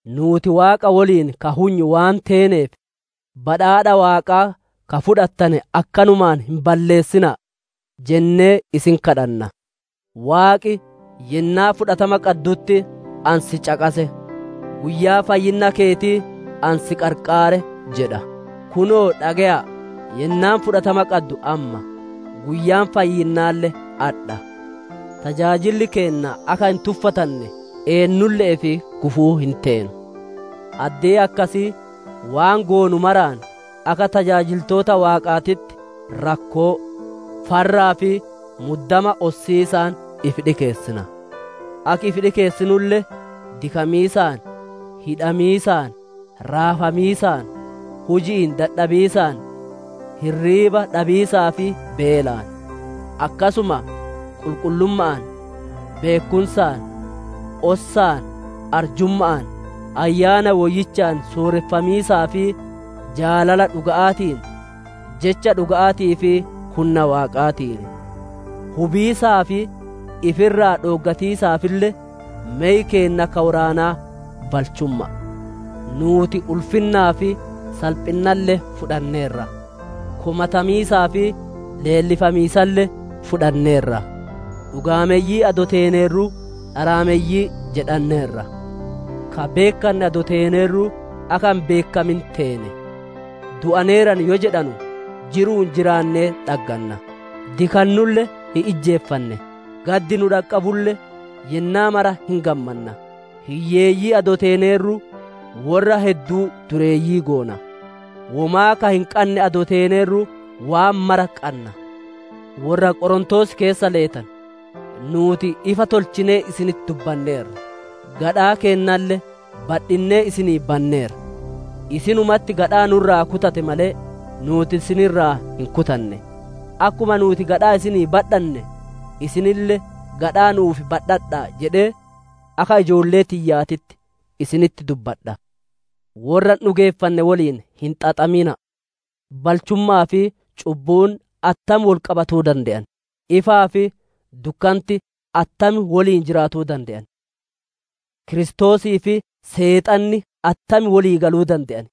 Nuuti Waaqa woliin ka hunyu waan teeneef, badhaadha Waaqaa ka fudhattane akkanumaan hin balleessina'a jennee isin kadhanna. Waaqi, «Yennaa na biratti fudhatama qaddutti ani si caqase; Guyyaa fayyinna keetii, ani si qarqaare» jedha. Kunoo dhage'a'a yennaan fudhatama qaddu amma; guyyaan fayyinnaalle adha. Tajaajilli keenna akka hin tuffatanne, eennulle'eef gufuu hin teenu. Addee akkasii waan goonu maraan akka tajaajiltoota Waaqaatitti rakkoo, farraa fi muddama ossiisaan ifi dhikeessina. Akki ifi dhikeessinulle: dikamiisaan, hidhamiisaan, raafamiisaan, huji'iin dadhabiisaan, hirriiba dhabiisaa fi beelaan; akkasuma qulqullumma'aan, beekkumsaan, ossaan, arjumma'aan, Ayyaana Woyyichaan sooreffamiisaa fi jaalala dhuga'aatiin, jecha dhuga'aatii fi hunna Waaqaatiin. Hubiisaa fi ifi irraa dhooggatiisaafille, mey keenna ka woraanaa balchumma'a. Nuuti ulfinnaa fi salphinnalle fudhanneerra; komatamiisaa fi leellifamiisalle fudhanneerra; dhugaameyyii adoo teeneerruu, dharaameyyii jedhanneerra; ka beekkanne adoo teeneerruu, akka hin beekkamin teene; du'aneeran yoo jedhanu, jiru'uun jiraannee dhagganna; dikannulle hin ijjeefanne; gaddi nu dhaqqabulle, yennaa mara hin gammanna; hiyyeeyyii adoo teeneerruu worra hedduu dureeyyii goona; womaa ka hin qanne adoo teeneerruu, waan maraa qanna. Worra Qorontoos keessa leetanu! Nuuti ifa tolchinee isinitti dubbanneerra; gadhaa keennalle badhinnee isinii banneerra. Isinumatti gadhaa nu irraa kutate malee, nuuti isin irraa hin kutanne. Akkuma nuuti gadhaa isinii badhanne, isinille gadhaa nu'uuf badhadha'aa jedhee akka ijoollee tiyyaatitti isinitti dubbadha. Worra hin dhugeeffanne woliin hin xaxamina'a. Balchumma'aa fi cubbuun attam wol qabatuu dande'an? Ifaa fi dukkanti attam woliin jiraatuu dande'an? Kiristoosii fi Seexanni attam wolii galuu dande'an?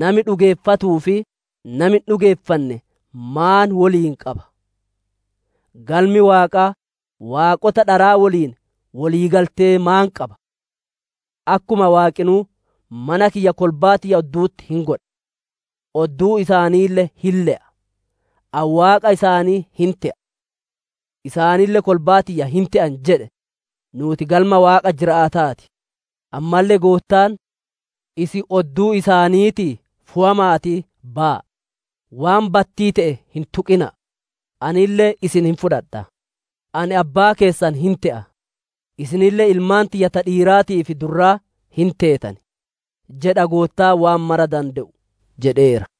Nami dhugeeffatuu fi nami hin dhugeeffanne maan woliin qaba? Galmi Waaqaa, waaqota dharaa woliin woliigaltee maan qaba? Akkuma Waaqinuu, «Mana kiyya kolbaa tiyya oddu'utti hin godha; odduu isaaniille hin le'a; Ani Waaqa isaanii hin te'a, isaanille kolbaa tiyya hin te'an» jedhe, nuuti Galma Waaqa jiraata'aa ti. Ammalle Goottaan, «Isin odduu isaaniitii fowama'atii baya'a; waan battii te'e hin tuqina'a. Anille isin hin fudhadha; Ani Abbaa keessan hin te'a, isinille ilmaan tiyya ta dhiiraatii fi durraa hin teetan jedha Goottaan waan mara dande'u» jedheera.